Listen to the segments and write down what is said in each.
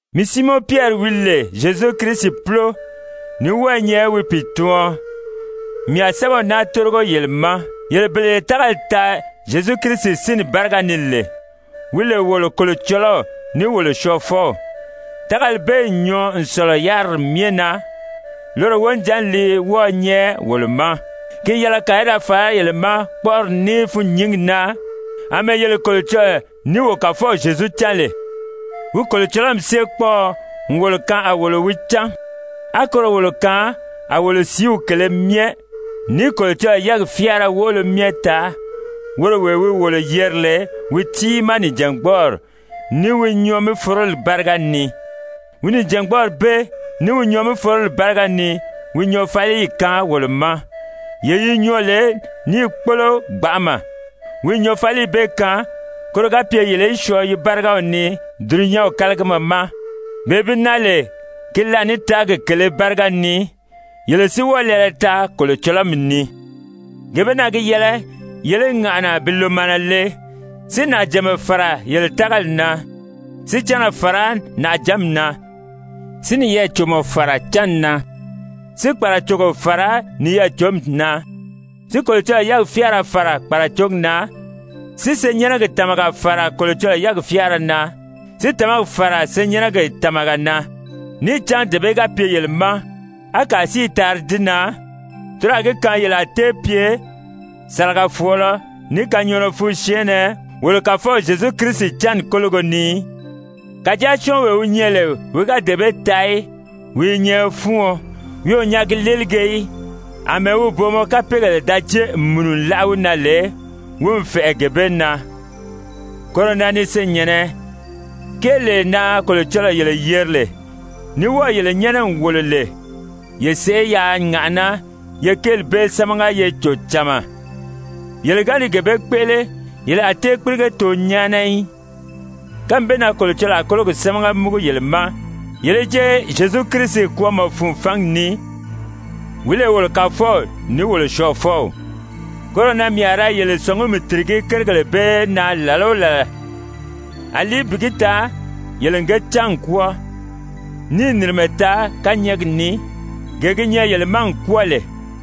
Mii Siimɔn Pyɛri wi lè Zyezu Kirisi púlo, ní wɔ́ɔ i nyɛ wi pìituɔn, mii a sɛ́bɛw naa tórigo yele ma, yele bele ye tágali taa Zyezu Kirisi sínni báriga ni lè, wi lè wolo Kolocɔlɔw ní wolo Syɔɔfɔw, tágali bee n nyɔɔ n sɔ̀lɔ yáriri myɛ na, loro wonijanni li wɔ́ɔ̄ nyɛ wolo ma. Ki n yɛlɛ kàa í da fàrá yele ma kpɔ́ʔɔri ní fûnnyingi na àmɛɛ yele Kolocɔlɔɔ ní wo Kàfɔw Zyezu càn lè. Wi Kolocɔlɔmi séekpɔɔɔ n wolo kaan a wolo wi cán, á koro wolo kaan a wolo sìíw kèlē myɛ, ní Kolocɔlɔɔ yɛ́ɛgi fyáara woʔolo myɛ taa, woro wee wi wolo yeri lè wi tiimaa nìjangbɔɔri, ní wi nyɔɔ-mí-foroli báriga ni. Wi nìjangbɔɔri bee ní wi nyɔɔ-mí-foroli báriga ni wi nyɔɔfaliyi kaan wolo ma, yee yi nyɔɔ lè níì kpólo gbanʔama, wi n nyɔɔfaliyi bee kaan koro ga pye yele í syɔɔ yi bárigaw ni dulunyanw kálagima ma, bee bi naa lè ki laànitaagi kèlē báriga ni, yele si wɔ́ɔ lɛɛlɛ taa kolocɔlɔmi ni. Gee bee na gi yɛlɛ yele í ŋàʔana bi lòmaana le si nàʔajànma fàra yele tágali na, si cánna fàra nàʔajǎnmi na, si niyɛɛ-còmɔ fàra cánni na, si kpàracogo fàra niyɛɛ-cǒmi na, si Kolocɔlɔɔ yɛ́ɛgi fyáara fàra kpàracogi na, si senyɛnnɛgi tàmaga fàra Kolocɔlɔɔ yɛ́ɛgi fyáara na, si tàmagi fàra senyɛnnɛgi tàmaga na. Níì cán dee bee ga pye yele ma, á kàa si i taari di na, toro a gi kaan yele a tée pye sàlagafɔɔlɔ ní kanyɔɔnɔ fun syɛɛnnɛ wolo Kàfɔw Zyezu Kirisi cánni kólogo ni í. Kàjáa syɔ́ɔnwee wi nyɛ lè wi ga dee bee taa í, wi i nyɛ fúuɔn, wi o nyaagi léelige í, àmɛɛ wi booma kapeegèle da jée n mùnu n láʔa wi na lè, wi n fɛ̀ʔɛ gee bee na. Koro na ni senyɛ̀nnɛ, kéelee na Kolocɔlɔɔ yele yeri lè, ní wɔ́ɔ̀ yele nyɛ́nɛ n wòlo lè, ye sèʔé yaa ŋàʔaná ye kéeli bee sámaga ye cò cama, yele ga ni gee bee kpéʔele, yele a tée kpírige too nyáana í. Kánmi bee na Kolocɔlɔɔ a kólogi sámaga múgu yele ma yele í jée Zyezu Kirisi kwɔ́ɔmɔ fun fangi ni, wi lè wolo Kàfɔw ní wolo Syɔɔfɔw. Koro na mii a ra yele sɔ̀ngumi tìrigí kérigèle bee na làla o làla, àlí bi gi taa yele n ge cán n kwɔ́ɔ, níì nìrimɛ taa kányɛɛgi ni, gee gi nyɛ yele ma n kwɔ́ɔ lè.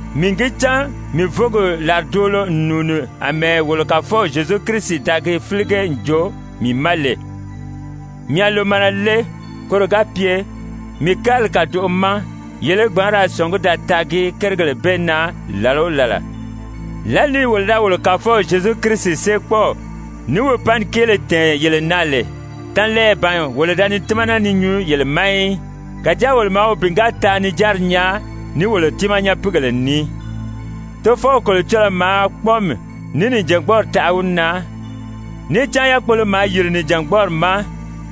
Mii n gi cán mii vǒgi làridoolo n nùuni àmɛɛ wolo Kàfɔw Zyezu Kirisi da gi fílige n joo mii ma lè. Mii a lòmaana le, koro ga pye, mii kárili kàdoʔo ma, yele í gbǎn ra sɔ̀ngí da taagi kérigèle bee na làla o làla. Lǎli ni wolo da wolo Kàfɔw Zyezu Kirisi séekpɔɔw ní wi panni kéele tɛ̀ɛn yele na lè, tanlɛɛyɛ ban wolo da ni tímana ni nyuu yele ma í, kàjáa wolo maa wi bìngaataa-nijanri nyaa ní wolo tiimaa nyapiigèle ní. Tofɔw Kolocɔlɔɔ maa kpɔ́ɔmi ní nìjangbɔɔri taʔa wi na, níì cán yákpolo maa yìri Nìjangbɔɔri ma,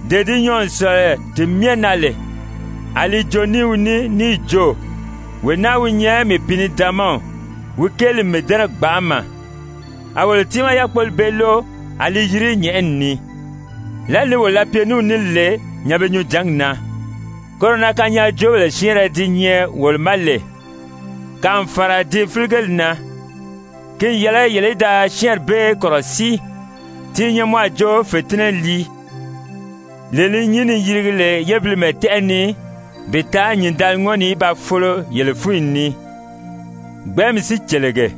dee di nyɔɔ n sɔ̀lɔ ti myɛ na lè, a li joo ní wi ní níì jo: «Wee naa wi nyɛ mii Pìinidaanmaw, wi kéeli n mii dɛ́nɛ gbanʔama.» A wolo tiimaa yákpoli bee lóʔo a li yiri nyɛ̀ʔɛni ni, lǎli ni wolo da pye ní wi ní lè nyanbe-nyunjǎngi na. Koro na kanyaajoobèle syɛ́ɛnrɛ di nyɛ wolo ma lè, kàa n fàra di fíligeli na, ki n yɛlɛ yele í da syɛ́ɛnri bee kɔ̀rɔsíi, ti i nyɛ mɔ a jo fètinnɛ lii, lee li nyín ni yirigi lè yébilimɛ tɛ́ʔɛ ni bi taa nyìndaliŋɔni í ba folo yele fúnyi ni, gbɛ̀ɛ́nmi si cèlege.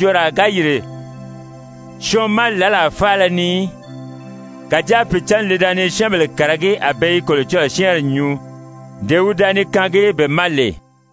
Níì cán kanyaajooraa ga yìri syɔɔn ma làlaa faala ni í, kàjáa Pìicǎnni li da ni syɛ́ɛnbèle kàragí a be i Kolocɔlɔɔ syɛ́ɛnri nyuu, dee wi da ni kaangi be ma lè.